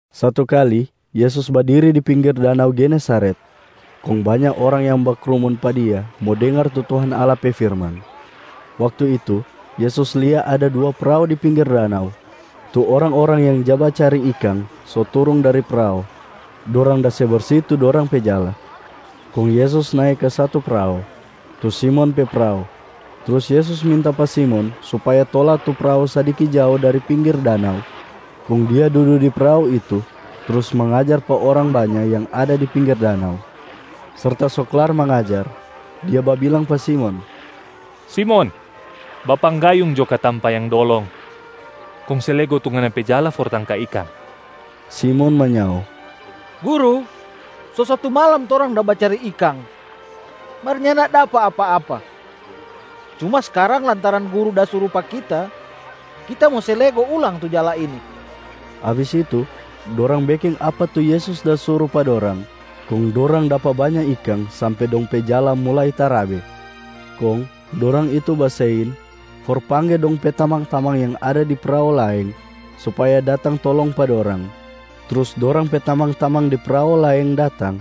Satu kali Yesus badiri di pinggir danau Genesareta, kong banya orang yang bakrumun pa Dia mo dengar tu Tuhan Allah pe firman. Waktu itu Yesus lia ada dua prao di pinggir danau. Tu orang-orang yang ja bacari ikang so turung dari prao, dorang da se bersi tu dorang pe jala. Kong Yesus nae ka satu prao, tu Simon pe prao. Trus Yesus minta pa Simon supaya tola tu prao sadiki jao dari pinggir danau. Kong Dia dudu di prao itu, trus mangajar pa orang banya yang ada di pinggir danau. Serta so klar mangajar, Dia babilang pa Simon, “Simon, bapanggayung jo ka tampa yang dolong kong se lego tu ngana pe jala for tangka ikang.” Simon manyao, “Guru, so satu malam torang da bacari ikang mar nyanda dapa apa-apa. Cuma skarang lantaran Guru da suru pa kita, kita mo se lego ulang tu jala ini.” Abis itu dorang beking apa tu Yesus da suru pa dorang, kong dorang dapa banya ikang sampe dong pe jala mulai tarabe. Kong dorang itu basein for pangge dong pe tamang-tamang yang ada di prao laeng supaya datang tolong pa dorang. Trus dorang pe tamang-tamang di prao laeng datang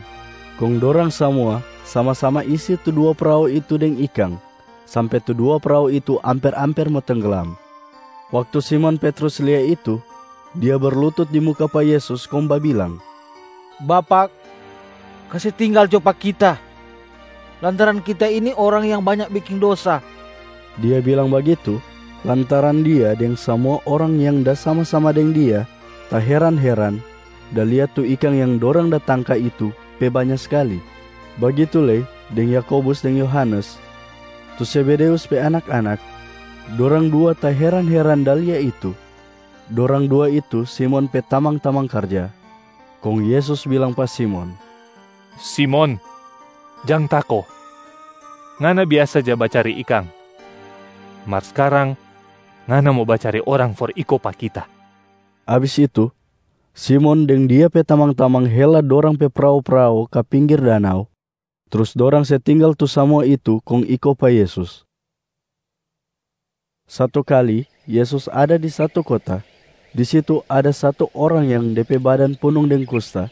kong dorang samua sama-sama isi tu dua prao itu deng ikang sampe tu dua prao itu amper-amper mo tengglam. Waktu Simon Petrus lia itu, dia berlutut di muka pa Yesus kong babilang, “Bapak, kase tinggal jo pa kita lantaran kita ini orang yang banya beking dosa.” Dia bilang bagitu lantaran dia deng samua orang yang da sama-sama deng dia taheran-heran da lia tu ikang yang dorang da tangka itu pe banya skali. Bagitu lei deng Yakobus deng Yohanes, tu Zebedeus pe anak-anak, dorang dua taheran-heran da lia itu. Dorang dua itu Simon pe tamang-tamang karja. Kong Yesus bilang pa Simon, “Simon, jang tako! Ngana biasa ja bacari ikang, mar skarang ngana mo bacari orang for iko pa Kita.” Abis itu Simon deng dia pe tamang-tamang hela dorang pe prao-prao ka pinggir danau, trus dorang se tinggal tu samua itu kong iko pa Yesus. Satu kali Yesus ada di satu kota. Di situ ada satu orang yang de pe badan punung deng kusta.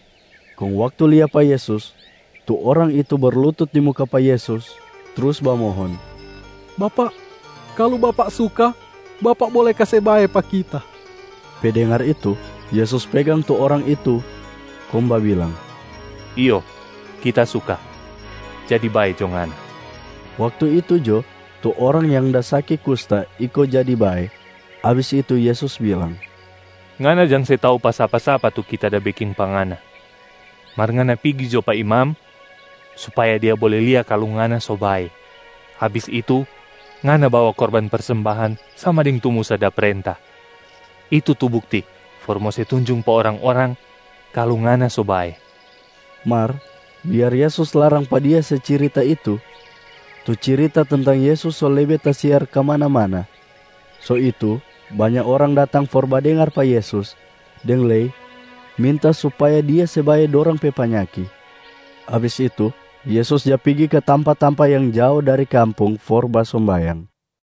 Kong waktu lia pa Yesus, tu orang itu berlutut di muka pa Yesus trus bamohon, “Bapak, kalu Bapak suka, Bapak bole kase bae pa kita.” Pe dengar itu, Yesus pegang tu orang itu kong babilang, “Iyo Kita suka, jadi bae jo ngana.” Waktu itu jo, tu orang yang da saki kusta iko jadi bae. Abis itu Yesus bilang, “Ngana jang se tau pa sapa-sapa tu Kita da beking pa ngana. Mar ngana pigi jo pa imam supaya dia bole lia kalu ngana so bae. Abis itu, ngana bawa korban persembahan sama deng tu Musa da prenta. Itu tu bukti for mo se tunjung pa orang-orang kalu ngana so bae.” Mar biar Yesus larang pa dia se cirita itu, tu cirita tentang Yesus so lebe tasiar kamana-mana. So itu banya orang datang for badengar pa Yesus deng lei minta supaya Dia se bae dorang pe panyaki. Abis itu Yesus ja pigi ka tampa-tampa yang jao dari kampung for basombayang.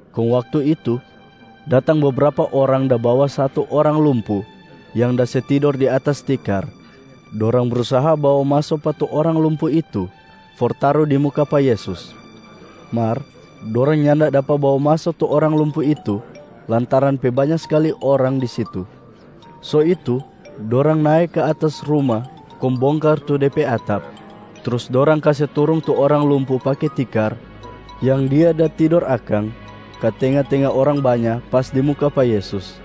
Kong waktu itu, datang bebrapa orang da bawa satu orang lumpu yang da se tidor di atas tikar. Dorang brusaha bawa maso pa tu orang lumpu itu for taru di muka pa Yesus. Mar dorang nyanda dapa bawa maso tu orang lumpu itu lantaran pe banya skali orang di situ. So itu dorang nae ka atas ruma kong bongkar tu de pe atap. Trus dorang kase turung tu orang lumpu pake tikar yang dia da tidor akang ka tenga-tenga orang banya pas di muka pa Yesus.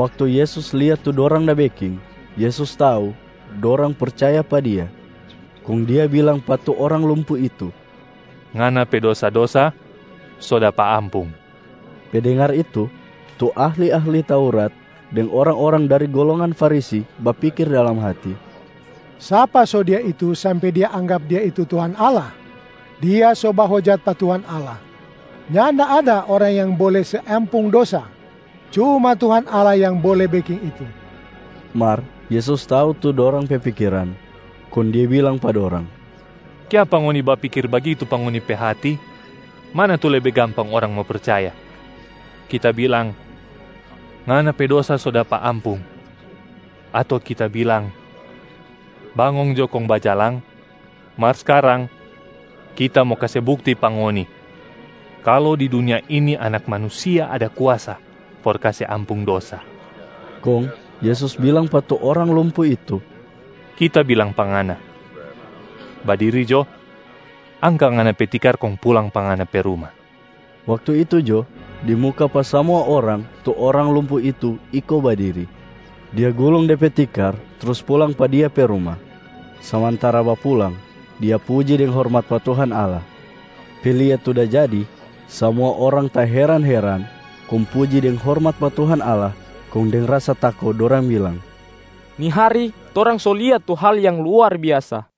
Waktu Yesus lia tu dorang da beking, Yesus tau dorang percaya pa Dia, kong Dia bilang pa tu orang lumpu itu, “Ngana pe dosa-dosa so dapa ampung.” Pe dengar itu, tu ahli-ahli Taurat deng orang-orang dari golongan Farisi bapikir dalam hati, “Sapa so Dia itu sampe Dia anggap Dia itu Tuhan Allah? Dia so bahojat pa Tuhan Allah. Nyanda ada orang yang bole se ampung dosa, cuma Tuhan Allah yang bole beking itu.” Mar Yesus tau tu dorang pe pikiran, kong Dia bilang pa dorang, “Kiapa ngoni bapikir bagitu pa ngoni pe hati? Mana tu lebe gampang orang mo percaya? Kita bilang, ‘Ngana pe dosa so dapa ampung,’ ato Kita bilang, ‘Bangong jo kong bajalang’? Mar skarang, Kita mo kase bukti pa ngoni kalu di dunia ini Anak Manusia ada kuasa for kase ampung dosa.” Kong Yesus bilang pa tu orang lumpu itu, “Kita bilang pa ngana, badiri jo, angka ngana pe tikar kong pulang pa ngana pe ruma!” Waktu itu jo, di muka pa samua orang tu orang lumpu itu iko badiri, dia gulung de pe tikar trus pulang pa dia pe ruma. Samantara bapulang, dia puji deng hormat pa Tuhan Allah. Pe lia tu da jadi, samua orang taheran-heran kong puji deng hormat pa Tuhan Allah. Kong deng rasa tako dorang bilang, “Ni hari torang so lia tu hal yang luar biasa.”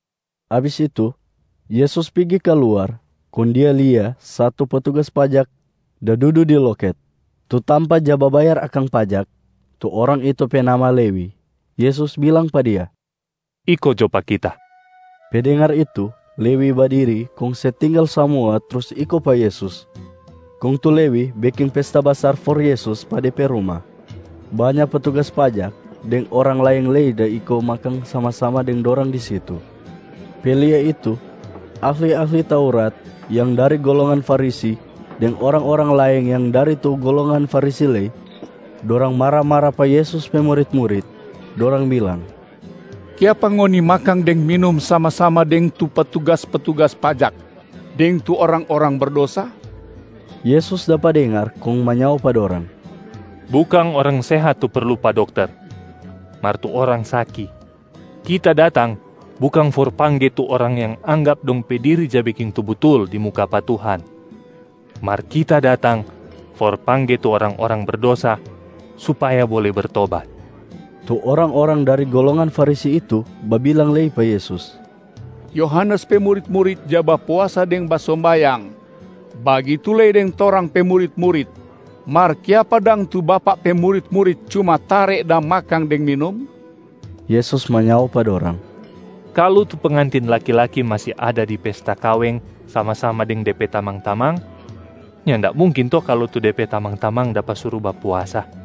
Abis itu Yesus pigi kaluar kong Dia lia satu petugas pajak da dudu di loket, tu tampa ja babayar akang pajak. Tu orang itu pe nama Lewi. Yesus bilang pa dia, “Iko jo pa Kita.” Pe dengar itu, Lewi badiri kong se tinggal samua trus iko pa Yesus. Kong tu Lewi beking pesta basar for Yesus pa de pe ruma. Banya petugas pajak deng orang laeng lei da iko makang sama-sama deng dorang di situ. Pe lia itu, ahli-ahli Taurat yang dari golongan Farisi deng orang-orang laeng yang dari tu golongan Farisi lei, dorang mara-mara pa Yesus pe murit-murit, dorang bilang, “Kiapa ngoni makang deng minum sama-sama deng tu petugas-petugas pajak deng tu orang-orang berdosa?” Yesus dapa dengar kong manyao pa dorang, “Bukang orang sehat tu perlu pa dokter mar tu orang saki. Kita datang bukang for pangge tu orang yang anggap dong pe diri ja beking tu butul di muka pa Tuhan, mar Kita datang for pangge tu orang-orang berdosa supaya bole bertobat.” Tu orang-orang dari golongan Farisi itu babilang lei pa Yesus, “Yohanes pe murit-murit ja bapuasa deng basombayang, bagitu lei deng torang pe murit-murit, mar kiapa dang tu Bapak pe murit-murit cuma tare da makang deng minum?” Yesus manyao pa dorang, “Kalu tu pengantin laki-laki masi ada di pesta kaweng sama-sama deng de pe tamang-tamang, nyanda mungkin to kalu tu de pe tamang-tamang dapa suru bapuasa.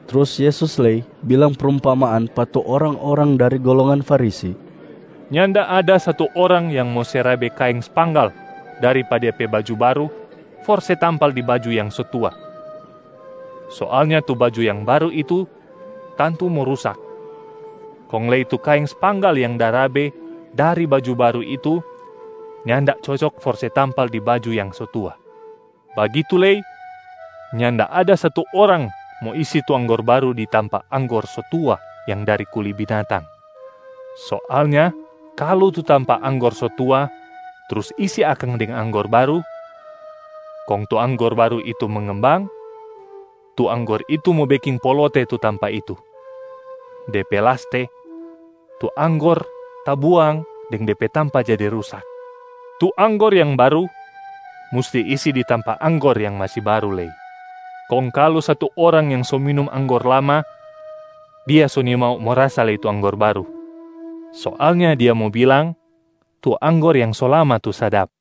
Trus Yesus lei bilang prumpamaan pa tu orang-orang dari golongan Farisi, “Nyanda ada satu orang yang mo se rabe kaeng spanggal dari pa dia pe baju baru for se tampal di baju yang so tua. Soalnya tu baju yang baru itu tantu mo rusak, kong lei tu kaeng spanggal yang da rabe dari baju baru itu nyanda cocok for se tampal di baju yang so tua. Bagitu lei, nyanda ada satu orang mo isi tu anggor baru di tampa anggor so tua yang dari kuli binatang. Soalnya kalu tu tampa anggor so tua, trus isi akang deng anggor baru, kong tu anggor baru itu mengembang, tu anggor itu mo beking polote tu tampa itu. De pe laste, tu anggor tabuang deng de pe tampa jadi rusak. Tu anggor yang baru musti isi di tampa anggor yang masi baru lei.b Kong kalu satu orang yang so minum anggor lama, dia so nimau mo rasa lei tu anggor baru. Soalnya dia mo bilang, ‘Tu anggor yang so lama tu sadap.’”